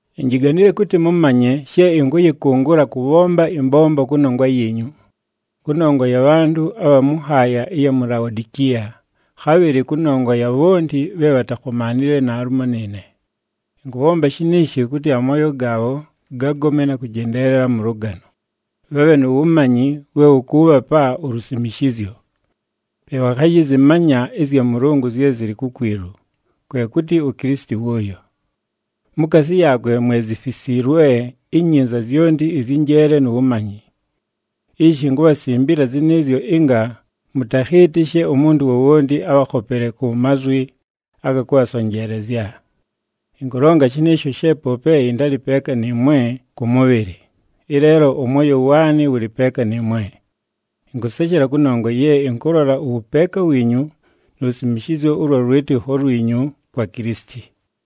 Injiganile kʉtɨ mʉmanye she ɨnkʉyɨkʉngʉla kʉbhomba ɨmbombo kʉnongwa yiinyu, kʉnongwa ya bhantʉ abha mʉ nhaaya ɨya mu Laodikiya, khabhɨlɨ kʉnongwa ya bhonti bhe bhatakhomaanile naalumo nɨɨne. Ɨnkʉbhomba shiniishi kʉtɨ amooyo gaabho gagome na kʉjendeelela mʉ lʉgano, bhabhe nu wumanyi we wʉkʉʉbhapa ulusimishizyo. Pe bhakhayɨzɨmanya ɨzya Mʉlʉngʉ zye zɨlɨ kukwilu, kwe kʉtɨ uKilisiti wʉʉyo. Mukaasi yaakwe mwe zifisiilwe inyinza zyonti ɨzyɨ njeele nu wumanyi. Ishi inkubhasimbila zɨnɨɨzyo ɨnga mʉtakhɨɨtɨshe umuntu wowonti abhakhopele ku mazwi aga kʉbhasonjeelezya. Ɨnkʉlonga shɨnɨɨsho she poope ɨntalɨ peeka nɨɨmwe kʉ mʉbhɨlɨ, ɨleelo ʉmwoyo waanɨ wʉlɨ peeka nɨɨmwe. Ɨnkʉseshela kʉnongwa ye ɨnkʉlola ʉwʉpeeka wiinyu nu lusimishizyo ʉlwa lwɨtɨkho lwinyu kwa Kilisiti.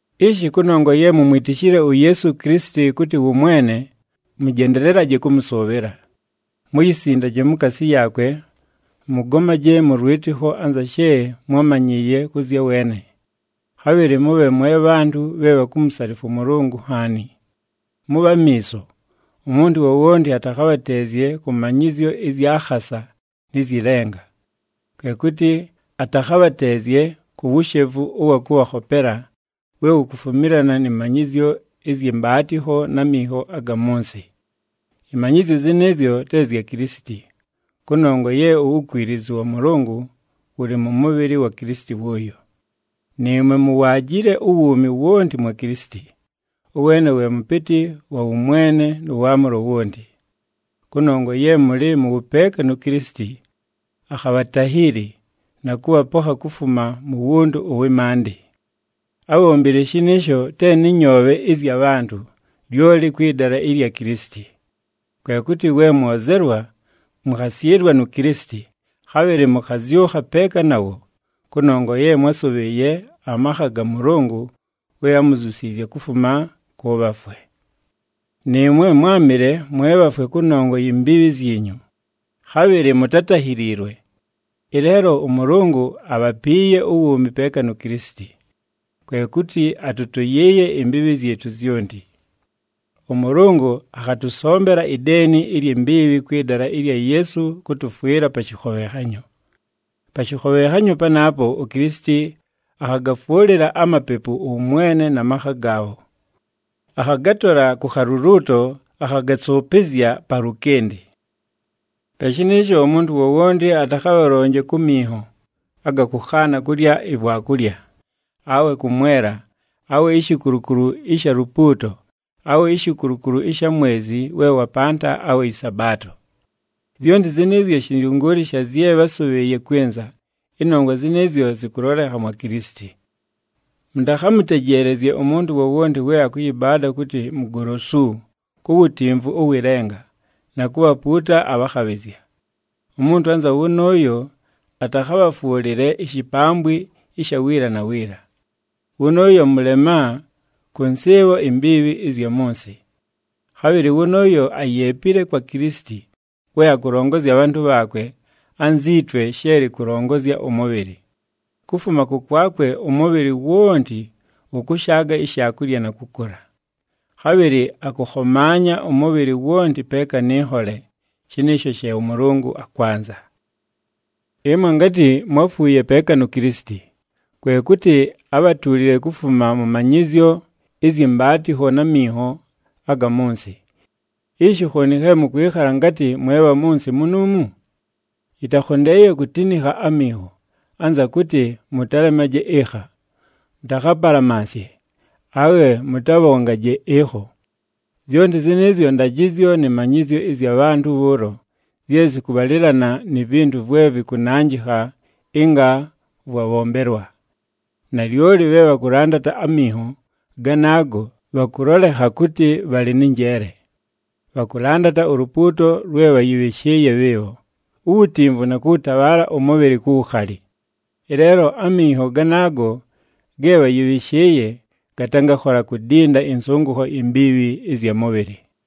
Ishi, kʉnongwa ye mumwitishile uYeesu Kilisiti kʉtɨ wʉ Mwene, mʉjendelelaje kʉmʉsʉʉbhɨla. Muyisindaje mukaasi yaakwe, mʉgomaje mʉ lwɨtɨkho anza she mwámanyɨɨye kʉ zya weene. Khabhɨlɨ mʉbhe mwe bhantʉ bhe bhakumusalifwa ʉMʉlʉngʉ nhaani. Mʉbhe amiiso, umuntu wowonti atakhabhateezye kʉ manyɨzyo ɨzya khasa nɨ zyɨ lenga. Kwe kʉtɨ atakhabhateezye ku wushevu ʉwa kʉbhakhopela, we wukufumilana nɨ manyɨzyo ɨzyɨ mbaatɨkho na minho aga mʉ nsɨ. Ɨmanyɨzyo zɨnɨɨzyo te zya Kilisiti, kʉnongwa ye uwukwilizu wa Mʉlʉngʉ wʉlɨ mʉ mʉbhɨlɨ wa Kilisiti wʉʉyo. Nɨɨmwe muwaajile uwuumi wonti mwa Kilisiti, ʉweene we mʉpɨtɨ wa wʉmwene nʉ waamʉlo wonti. Kʉnongwa ye mʉlɨ mʉ wʉpeeka nu Kilisiti, akhabhatahiili, na kʉbhapokha kufuma mu wuntu ʉwɨ maandɨ. Ábhombile shɨnɨɨsho te nɨ nyoobhe ɨzya bhantʉ, lyoli kwɨ dala ɨlya Kilisiti. Kwe kʉtɨ we mwozelwa, mʉkhasyɨlwa nu Kilisiti, khabhɨlɨ mʉkhazyʉkha peeka nawo, kʉnongwa ye mwásʉbhɨɨye amakha ga Mʉlʉngʉ we ámuzyusiizye kufuma kʉ bhafwe. Nɨɨmwe mwámɨle mwe bhafwe kʉnongwa yi mbiibhi zyinyu, khabhɨlɨ mutátahiliilwe. Ɨleelo ʉMʉlʉngʉ abhapiiye uwuumi peeka nu Kilisiti. Kwe kʉtɨ atʉtʉyɨɨye imbiibhi zyɨtʉ zyonti. ɄMʉlʉngʉ akhatʉsombela ideeni ilyi mbiibhi kwɨ dala ɨlya Yeesu kʉtʉfwɨla pa shɨkhobhenhanyo. Pa shɨkhobhenhanyo panaapo uKilisiti akhagafwʉlɨla amapepu ʉwʉmwene na makha gaabho, akhagatola ku khaluluuto akhagasʉʉpɨzya palʉkɨndɨ. Pe shɨnɨɨsho umuntu wowonti atakhabhalonje ku minho aga kʉkhaana kulya ivwakulya, awe kʉmwela, awe ishikulukulu ɨsha lupuuto, awe ishikulukulu ɨsha mwezi we wapanta awe ɨSabaato. Zyonti zɨnɨɨzyo shɨnzyʉngʉʉlɨ sha zye bhásʉbhɨɨye kwɨnza, ɨnongwa zɨnɨɨzyo zɨkʉlolekha mwa Kilisiti. Mʉtakhamʉtejeelezye umuntu wowonti we akʉyɨbaada kʉtɨ mugolosu ku wutimvu ʉwɨ lenga, na kubhapuuta abhakhabhɨzya. Umuntu anza wʉnʉʉyo atakhabhafwʉlɨle ishipambwi ɨsha wiila na wiila. Wʉnʉʉyo mʉlema kʉ nsɨɨbho imbiibhi ɨzya mʉ nsɨ. Khabhɨlɨ wʉnʉʉyo ayeepile kwa Kilisiti we akʉlongozya abhantʉ bhaakwe anzi twe she lɨkʉlongozya ʉmʉbhɨlɨ. Kufuma kʉkwakwe ʉmʉbhɨlɨ wonti wʉkʉshaaga ishaakulya na kʉkʉla. Khabhɨlɨ akʉkhomaanya ʉmʉbhɨlɨ wonti peeka nɨ nhole, shɨnɨɨsho she ʉMʉlʉngʉ akwanza. Ɨmwe ngatɨ mwáfuuye peeka nu Kilisiti, kwe kʉtɨ ábhatuulile kufuma mʉ manyɨzyo ɨzyɨ mbaatɨkho na minho aga mʉ nsɨ. Ishi khooni khe mʉkwɨkhala ngatɨ mwe bha mʉ nsɨ munuumu? Yɨtakhondeeye kutinikha aminho, anza kʉtɨ, “Mʉtalemaje ɨkha, mʉtakhapalamansye, awe mʉtabhongaje ɨkho!” Zyonti zɨnɨɨzyo ndajɨzyo nɨ manyɨzyo ɨzya bhantʉ bhʉʉlo zye zɨkʉbhalɨlana ni vintu vwe vɨkʉnanjɨkha ɨnga vwabhombelwa. Nalyoli bhe bhakʉlandata aminho ganaago bhakʉlolekha kʉtɨ bhalɨ nɨ njeele. Bhakʉlandata ulupuuto lwe bhayɨbhɨshɨɨye bhɨɨbho, uwutimvu na kʉwʉtabhaala ʉmʉbhɨlɨ ku wukhali. Ɨleelo aminho ganaago ge bhayɨbhɨshɨɨye gatangakhola kudinda ɨnsʉngʉkho imbiibhi ɨzya mʉbhɨlɨ.